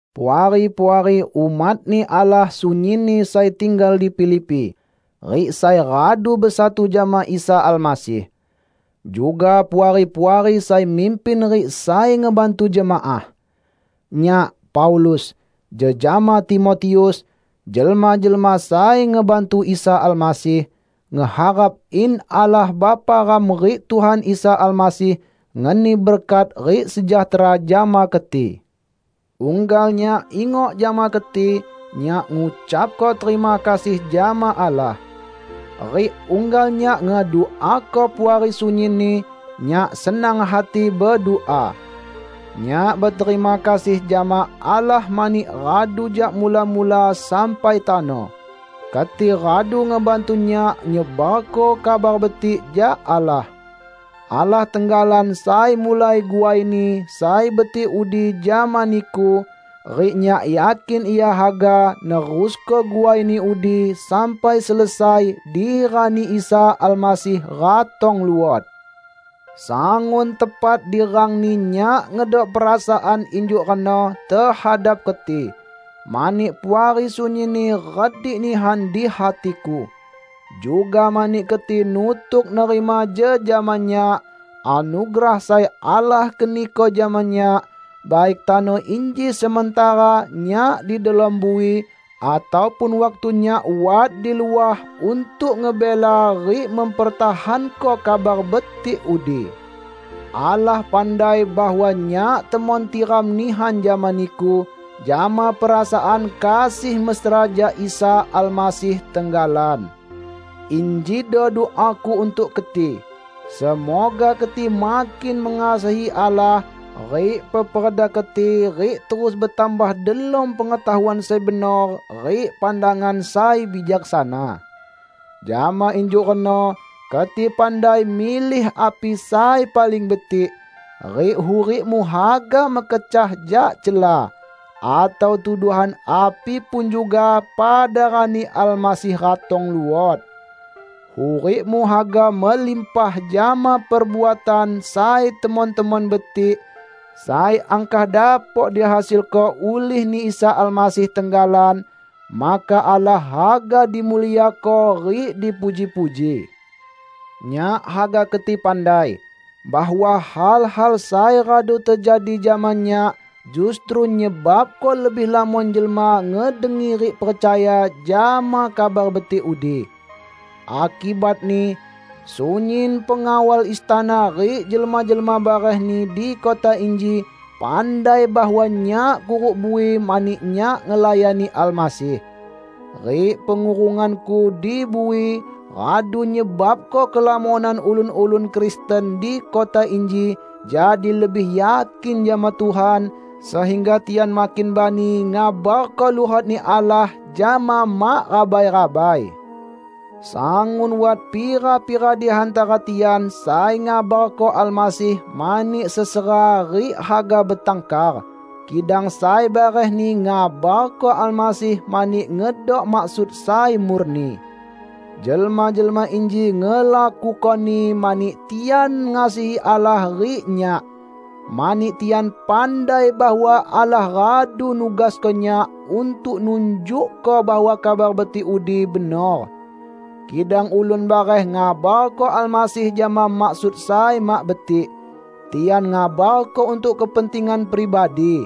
Puari-puari umat-Ni Allah sunyinni sai tinggal di Filipi, rik sai radu besatu jama Isa Almasih. Juga Puari-puari sai mimpin rik sai ngebantu jemaah! Nyak, Paulus, jejama Timotius, jelma-jelma sai ngebantu Isa Almasih, ngeharap in Allah Bapa ram rik Tuhan Isa Almasih ngeni berkat rik sejahtera jama keti. Unggal nyak ingok jama keti, nyak ngucapko terima kasih jama Allah. Rik unggal nyak ngeduako Puari sunyinni, nyak senang hati bedua. Nyak beterima kasih jama Allah mani radu jak mula-mula sampai tano, keti radu ngebantu nyak nyebarko Kabar Betik jak Allah. Allah tenggalan sai mulai guaini sai betik udi jama niku, rik nyak yakin Ia haga nerusko guaini udi sampai selesai di Rani Isa Almasih ratong luot. Sangun tepat di rangni nyak ngedok perasaan injuk reno tehadap keti, mani Puari sunyinni redik nihan di hatiku. Juga mani keti nutuk nerima jejama nyak, anugerah sai Allah keniko jama nyak; baik tano inji sementara nyak di delom bui ataupun waktu nyak wat di luah untuk ngebela rik mempertahanko Kabar Betik udi. Allah pandai bahwa nyak temon tiram nihan jama niku jama perasaan kasih mesra jak Isa Almasih tenggalan. Injido duaku untuk keti: semoga keti makin mengasihi Allah rik peperda keti rik terus betambah delom pengetahuan sai benor rik pandangan sai bijaksana. Jama injuk reno keti pandai milih api sai paling betik, rik hurikmu haga mekecah jak cela atau tuduhan api pun juga pada rani Almasih ratong luot. Hurikmu haga melimpah jama perbuatan sai temon-temon betik sai angkah dapok dihasilko ulih-Ni Isa Almasih tenggalan; maka Allah haga dimuliako rik dipuji-puji. Nyak haga keti pandai, bahwa hal-hal sai radu tejadi jama nyak justru nyebabko lebih lamon jelma ngedengi rik percaya jama Kabar Betik udi. Akibatni, sunyin pengawal istana rik jelma-jelma barehni di kota inji pandai bahwa nyak kuruk bui mani nyak ngelayani Almasih. Rik pengurunganku di bui radu nyebabko kelamonan ulun-ulun Kristen di kota inji jadi lebih yakin jama Tuhan, sehingga tian makin bani ngabarko luhot-Ni Allah jama mak rabai-rabai. Sangun wat pira-pira di hantara tian sai ngabarko Almasih mani sesera rik haga betangkar, kidang sai barehni ngabarko Almasih mani ngedok maksud sai murni. Jelma-jelma inji ngelakukoni mani tian ngasihi Allah rik nyak, mani tian pandai bahwa Allah radu nugasko nyak untuk nunjukko bahwa Kabar Betik udi benor. Kidang ulun bareh ngabarko Almasih jama maksud sai mak betik; tian ngabarko untuk kepentingan pribadi.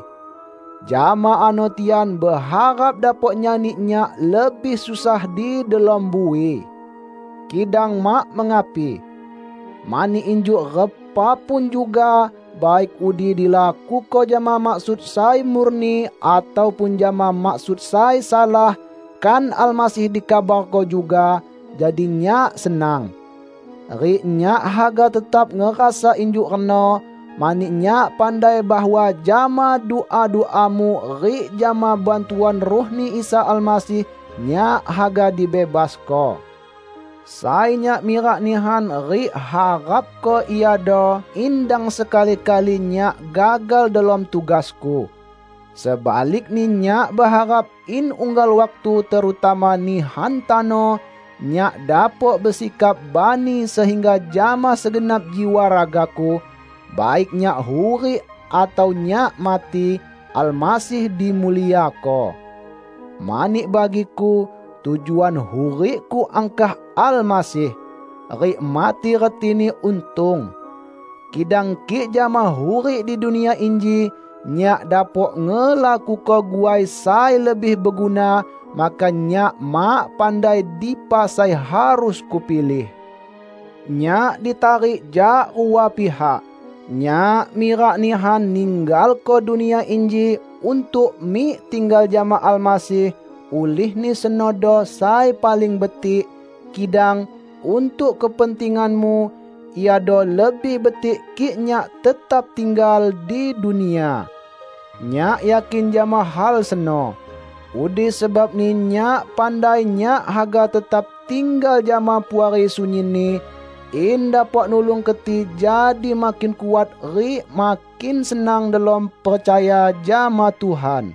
Jama ano tian beharap dapok nyani nyak lebih susah di delom bui. Kidang mak mengapi! Mani injuk repa pun juga, baik udi dilakuko jama maksud sai murni ataupun jama maksud sai salah, kan Almasih dikabarko juga; jadi nyak senang. Rik nyak haga tetap ngerasa injuk reno, mani nyak pandai bahwa jama dua-duamu rik jama bantuan Ruh-Ni Isa Almasih, nyak haga dibebasko. Sai nyak mirak nihan rik harapko iado in dang sekali-kali nyak gagal delom tugasku. Sebalikni nyak beharap in unggal waktu terutama nihan tano, nyak dapok besikap bani sehingga jama segenap jiwa ragaku -- baik nyak hurik atau nyak mati -- Almasih dimuliako. Mani bagiku, tujuan hurikku angkah Almasih! Rik mati retini untung. Kidang kik jama hurik di dunia inji, nyak dapok ngelakuko guai sai lebih beguna, maka nyak mak pandai dipa sai harus kupilih. Nyak ditarik jak rua pihak. Nyak mirak nihan ninggalko dunia inji untuk mik tinggal jama Almasih, ulihni senodo sai paling betik; kidang, untuk kepentinganmu, iado lebih betik kik nyak tetap tinggal di dunia. Nyak yakin jama hal seno. Udi sebabni nyak pandai nyak haga tetap tinggal jama Puari sunyinni, in dapok nulung keti jadi makin kuat rik makin senang delom percaya jama Tuhan.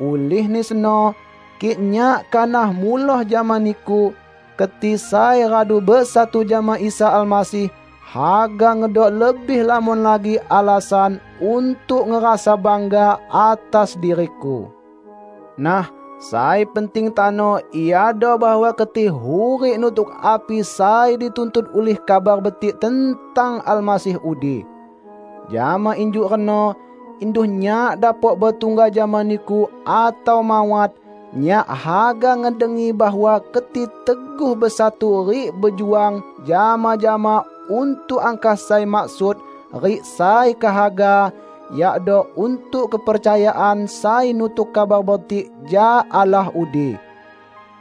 Ulihni seno, kik nyak kanah muloh jama niku, keti sai radu besatu jama Isa Almasih haga ngedok lebih lamon lagi alasan untuk ngerasa bangga atas diriku. Nah, sai penting tano iado bahwa keti hurik nutuk api sai dituntut ulih Kabar Betik tentang Almasih udi. Jama injuk reno, induh nyak dapok betungga jama niku atau mawat, nyak haga ngedengi bahwa keti teguh besatu rik bejuang jama-jama untuk angkah sai maksud rik sai kehaga; yakdo untuk kepercayaan sai nutuk Kabar Betik jak Allah udi.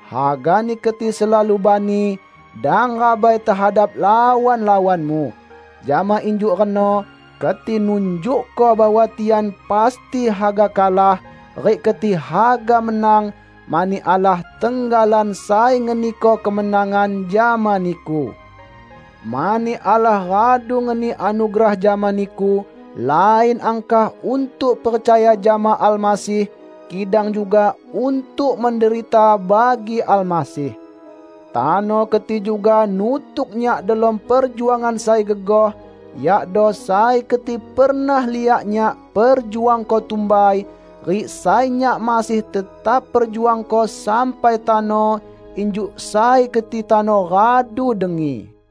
Hagani keti selalu bani; dang rabai tehadap lawan-lawanmu. Jama injuk reno keti nunjukko bahwa tian pasti haga kalah, rik keti haga menang, mani Allah tenggalan sai ngeniko kemenangan jama niku. Mani Allah radu ngeni anugerah jama niku lain angkah untuk percaya jama Almasih, kidang juga untuk menderita bagi Almasih. Tano keti juga nutuk nyak delom perjuangan sai gegoh, yakdo sai keti pernah liak nyak perjuangko tumbai, rik sai nyak masih tetap perjuangko sampai tano, injuk sai keti tano radu dengi.